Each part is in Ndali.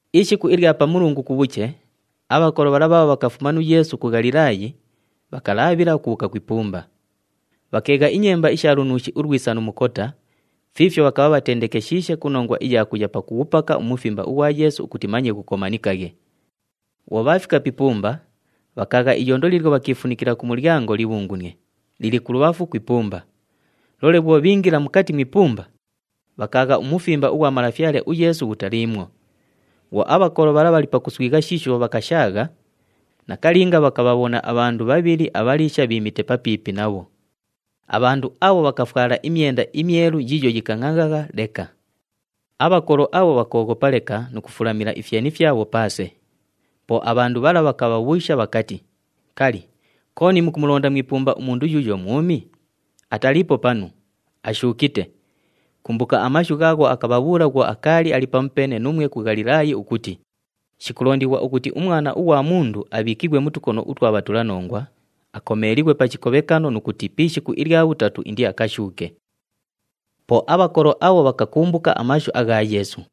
Ishiku ilya Pamulungu kubhuche, abhakolo bhala bhaabho bhakafuma nu Yeesu ku Ghalilaayi, bhakalaabhila ukubhuuka ku ipumba. Bhakeegha inyemba isha lunuushi ulwisa nu mukota fiifyo bhakabha bhatendekeshiishe ku nongwa iya kuya pakughupaka umufimba ughwa Yeesu ukuti manye ghukomanikaghe. Bhwo bhaafika pi ipumba, bhakaagha iyondo liilyo bhakiifunikila ku mulyango libhungunie, lili kulubhafu ku ipumba. Loole bhwo bhiingila mukati mu ipumba, bhakaagha umufimba ughwa Malafyale uYeesu ghutaliimwo. Bhwo abhakolo bhala bhali pakuswigha shiisho bhakashaagha, nakalinga bhakabhabhona abhandu bhabhili abhaliisha bhiimite papiipi nabho. Abhandu abho bhakafwala imyenda imyelu yiiyo yikangʼangʼagha leka. Abhakolo abho bhakooghopa leka nu kufulamila ifyeni fyabho paase. Po abhandu bhala bhakabhabhuusha bhakati, “Kali, kooni mukumulonda mu ipumba umundu yuuyo mwumi? Ataliipo panu! Ashuukite! Kumbuka amashu ghaagho akabhabhuula bhwo akaali ali pamupeene nuumwe ku Ghalilaayi ukuti, ‘Shikulondighwa ukuti uMwana ughwa Mundu abhiikighwe mu tukono utwa bhandu abhatulanongwa, akomeelighwe pa chikobhekano nu kuti pi ishiku ilya bhutatu indiakashuuke.’” Po abhakolo abho bhakakumbuka amashu agha Yeesu.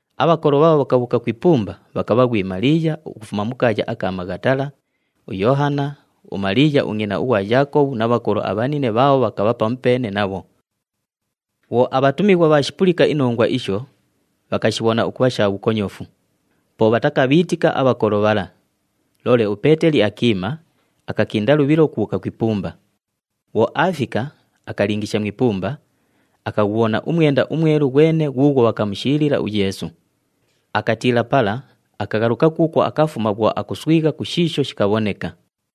Abhakolo bhaabho bhakabhuuka ku ipumba bhakabha ghwi Maliiya ukufuma mu kaaya aka Maghatala, uYoohana, uMaliiya ungʼina ughwa Yaakobhu na bhakolo abhanine bhaabho bhakabha pamupeene nabho. Bhwo abhatumighwa bhaashipulika inongwa isho, bhakashibhona ukubha sha bhukonyofu. Po bhatakabhiitika abhakolo bhala. Loole uPeeteli akiima, akakinda lubhilo ukubhuuka ku ipumba. Bhwo aafika, akalingisha mu ipumba, akaghubhona umwenda umwelu ghwene ghuughwo bhakamushiilila uYeesu. Akatiila pala, akaghaluka kuukwo akafuma bhwo akuswigha ku shiisho shikabhoneka.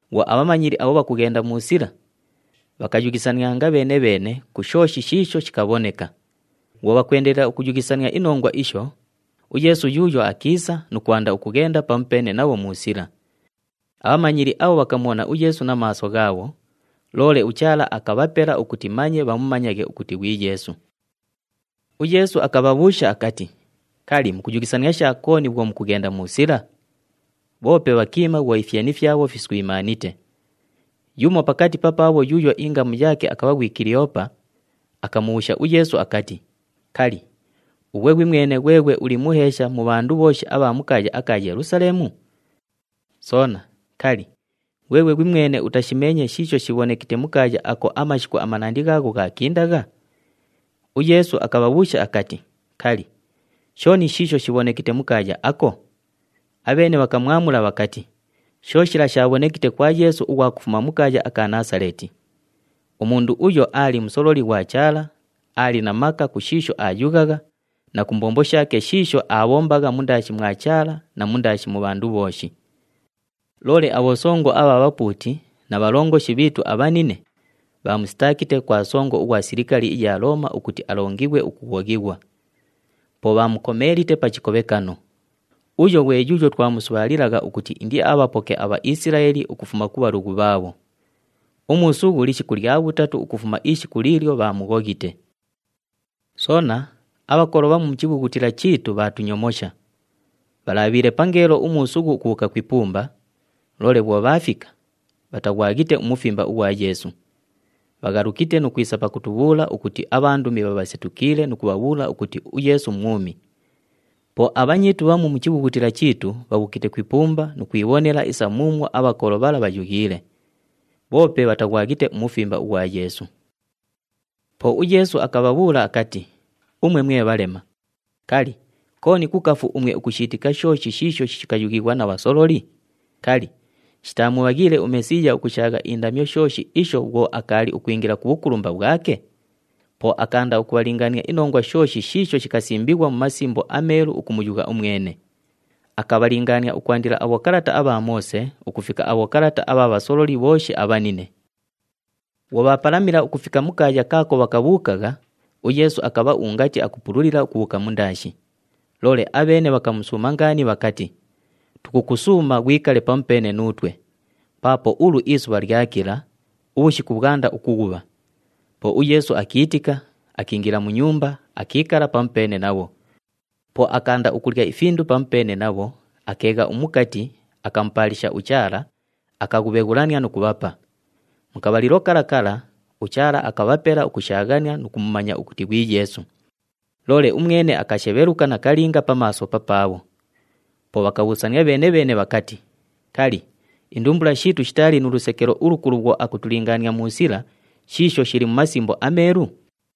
Bhwo abhamanyili abho bhakughenda mu sila, bhakayughisanianga bheene-bheene ku shooshi shiisho shikabhoneka. Bhwo bhakwendelela ukuyughisania inongwa isho, uYeesu yuuyo akiisa nu kwanda ukughenda pamupeene nabho mu sila. Abhamanyili abho bhakamubhona uYeesu na maaso ghaabho, loole uChaala akabhapela ukuti manye bhamumanyaghe ukuti ghwi Yeesu. UYeesu akabhabhuusha akati, “Kali, mukuyughisania sha kooni bhwo mukughenda mu sila?” Bhoope bhakiima bhwo ifyeni fyabho fiswimaanite. Yumo pakati papaabho yuuyo ingamu yaake akabha ghwi Kiliyoopa, akamubhuusha uYeesu akati, “Kali, ughwe ghwimwene ghweghwe uli muheesha mu bhandu bhooshi abha mu kaaya aka Yelusaleemu? Soona, kali, ghweghwe ghwimwene utashimeenye shiisho shibhonekite mu kaaya ako amashiku manandi ghaagho ghaakindagha?” UYeesu akabhabhuusha akati, “Kali, shooni shiisho shibhonekite mu kaaya ako?” Abheene bhakamwamula bhakati, “Sho shila shaabhonekite kwa Yeesu ughwa kufuma mu kaaya aka Naasaleeti. Umundu uyo aali musololi ghwa Chaala, aali na maka ku shiisho aayughagha, na ku mbombo shaake shiisho aabhombagha mundaashi mwa Chaala na mundaashi mu bhandu bhooshi. Loole abhosongo abha bhapuuti na bhalongoshi bhiitu abhanine, bhaamusitaakite kwa songo ughwa silikali iya Looma ukuti alongighwe ukughoghighwa. Po bhaamukomeelite pa chikobhekano. Uyo ghwe yuuyo twamusubhaalilagha ukuti indiabhapoke aBhaisilaeli ukufuma ku bhalughu bhaabho. Umuusughu lishiku lya bhutatu ukufuma ishiku liilyo bhaamughoghite. “Soona, abhakolo bhamu mu chibhughutila chiitu bhaatunyomosha. Bhalabhiile pangeelo umuusughu ukubhuuka ku ipumba, loole bhwo bhaafika, bhataghwaghite umufimba ughwa Yeesu. Bhaghalukite nu kwisa pakutubhuula ukuti abhandumi bhabhasetukiile nu kubhabhuula ukuti uYeesu mwumi. Po abhanyiitu bhamu mu chibhughutila chiitu bhabhuukite ku ipumba nu kwibhonela isa muumwo abhakolo bhala bhayughiile, bhoope bhataghwaghite umufimba ughwa Yeesu.” Po uYeesu akabhabhuula akati, “Umwe mwe bhalema! Kali, kooni kukafu umwe ukushiitika shooshi shiisho shikayughighwa na bhasololi? Kali, shitaamubhaghiile uMesiiya ukushaagha indamyo shooshi isho bhwo akaali ukwingila ku bhukulumba bhwake?” Po akaanda ukubhalingaania inongwa shooshi shiisho shikasimbighwa mu Masimbo aMeelu ukumuyugha umwene. Akabhalingaania ukwandila abhokalata abha Moose ukufika abhokalata abha bhasololi bhooshi abhanine. Bhwo bhaapalamila ukufika mu kaaya kaako bhakabhuukagha, uYeesu akabha ungati akupululila ukubhuuka mundaashi. Loole abheene bhakamusuuma ngaani bhakati, “Tukukusuuma ghwikale pamupeene nuutwe! Paapo ulu isubha lyakila, ubhushiku bhwanda ukughubha.” Po uYeesu akiitika, akiingila mu nyumba, akiikala pamupeene nabho. Po akaanda ukulya ifindu pamupeene nabho, akeegha umukati, akamupaalisha uChaala, akaghubheghulania nu kubhapa. Mu kabhalilo kala kala, uChaala akabhapela ukushaaghania nu kumumanya ukuti ghwi Yeesu. Loole umwene akashebheluka nakalinga pa maaso papaabho. Po bhakabhuusania bheene-bheene bhakati, “Kali, indumbula shiitu shitaali nu lusekelo ulukulu bhwo akutulingaania mu sila shiisho shili mu Masimbo aMeelu?”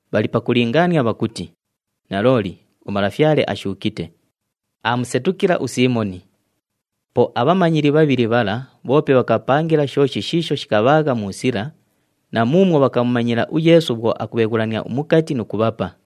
bhali pakulingaania bhakuti, “Nalooli, uMalafyale ashuukite! Aamusetukila uSiimoni!” Po abhamanyili bhabhili bhala bhoope bhakabhapangila shooshi shiisho shikabhaagha mu sila, na muumwo bhakamumanyila uYeesu bhwo akubheghulania umukati nu kubhapa.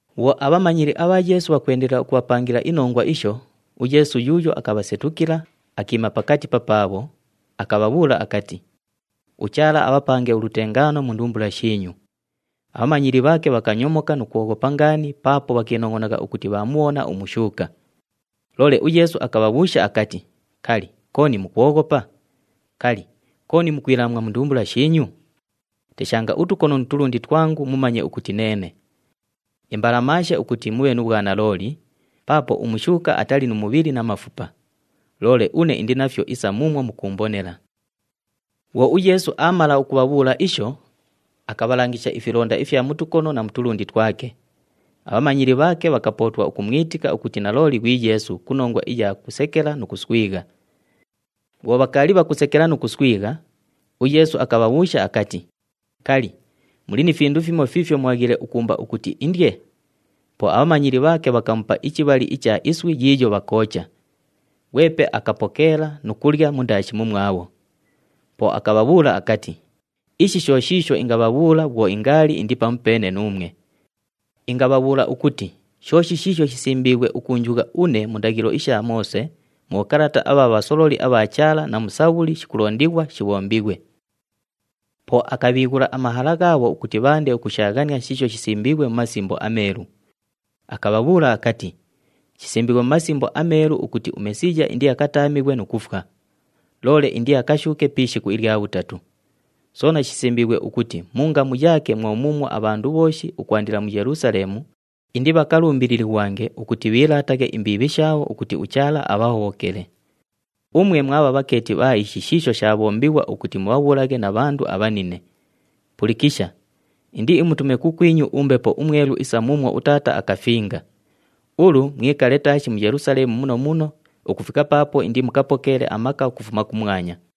Bhwo abhamanyili abha Yeesu bhakwendelela ukupangilana inongwa isho, uYeesu yuuyo akabhasetukila, akiima pakati papaabho, akabhabhuula akati, “UChaala abhapange ulutengaano mu ndumbula shiinyu!” Abhamanyili bhaake bhakanyomoka nu kwoghopa ngaani paapo bhakiinongʼonagha ukuti bhaamubhona umushuuka. Loole uYeesu akabhabhuusha akati, “Kali, kooni mukwoghopa? Kali, kooni mukwilaamwa mu ndumbula shiinyu? Teshanga utukono nu tulundi twangu mumanye ukuti neene. Imbalamaashe ukuti mubhe nu bhwanalooli, paapo umushuuka atali nu mubhili na mafupa. Loole une indi nafyo isa muumwo mukuumbonela.” Bhwo uYeesu aamala ukubhabhuula isho, akabhalangisha ifilonda ifya mu tukono na tulundi twake. Abhamanyili bhaake bhakapootwa ukumwitika ukuti nalooli ghwi Yeesu ku nongwa iya kusekela nu kuswigha. Bhwo bhakaali bhakusekela nu kuswigha, uYeesu akabhabhuusha akati, “Kali, muli ni findu fimo fiifyo mubhaghiile ukuumba ukuti indye?” Po abhamanyili bhaake bhakamupa ichibhali icha iswi yiiyo bhakoocha. Ghwepe akapokeela nu kulya mundaashi mumwabho. Po akabhabhuula akati, “Ishi sho shiisho ingabhabhuula bhwo ingaali indi pamupeene nuumwe. Ingabhabhuula ukuti shooshi shiisho shisimbiighwe ukuunjugha une mu ndaghilo isha Moose, mu bhokalata abha bhasololi abha Chaala na mu Sabhuli shikulondighwa shibhombighwe.” Po akabhiighula amahala ghaabho ukuti bhaande ukushaaghania shiisho shisimbiighwe mu Masimbo aMeelu. Akabhabhuula akati, “Shisimbiighwe mu Masimbo aMeelu ukuti uMesiiya indiakataamighwe nu kufwa. Loole indiakashuuke pi ishiku ilya bhutatu. Soona shisimbiighwe ukuti mu ngamu yaake mwo muumwo abhandu bhooshi ukwandila mu Yelusaleemu, indibhakalumbililighwange ukuti bhiilaataghe imbiibhi shaabho ukuti uChaala abhahobhokele. Umwe mwabha bhakeeti bha ishi shiisho shaabhombighwa ukuti mubhabhuulaghe na bhandu abhanine. “Pulikisha! Indiimutume kukwinyu uMbepo uMwelu isa muumwo uTaata akafinga. Ulu mwikale taashi mu Yelusaleemu muno muno ukufika paapo indimukapokeele amaka ukufuma kumwanya.”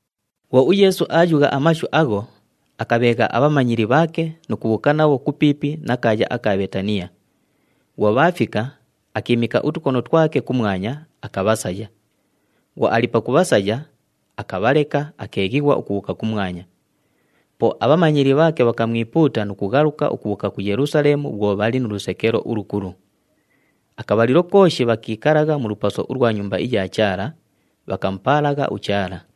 Bhwo uYeesu aayugha amashu agho, akabheegha abhamanyili bhaake nu kubhuuka nabho kupiipi na kaaya aka Bheetaniya. Bhwo bhaafika, akiimika utukono twake kumwanya, akabhasaya. Bhwo ali pakubhasaya, akabhaleka, akeeghighwa ukubhuuka kumwanya. Po abhamanyili bhaake bhakamwipuuta nu kughaluka ukubhuuka ku Yelusaleemu bhwo bhali nu lusekelo ulukulu. Akabhalilo kooshi bhakiikalagha mu lupaso ulwa Nyumba iya Chaala, bhakamupaalagha uChaala.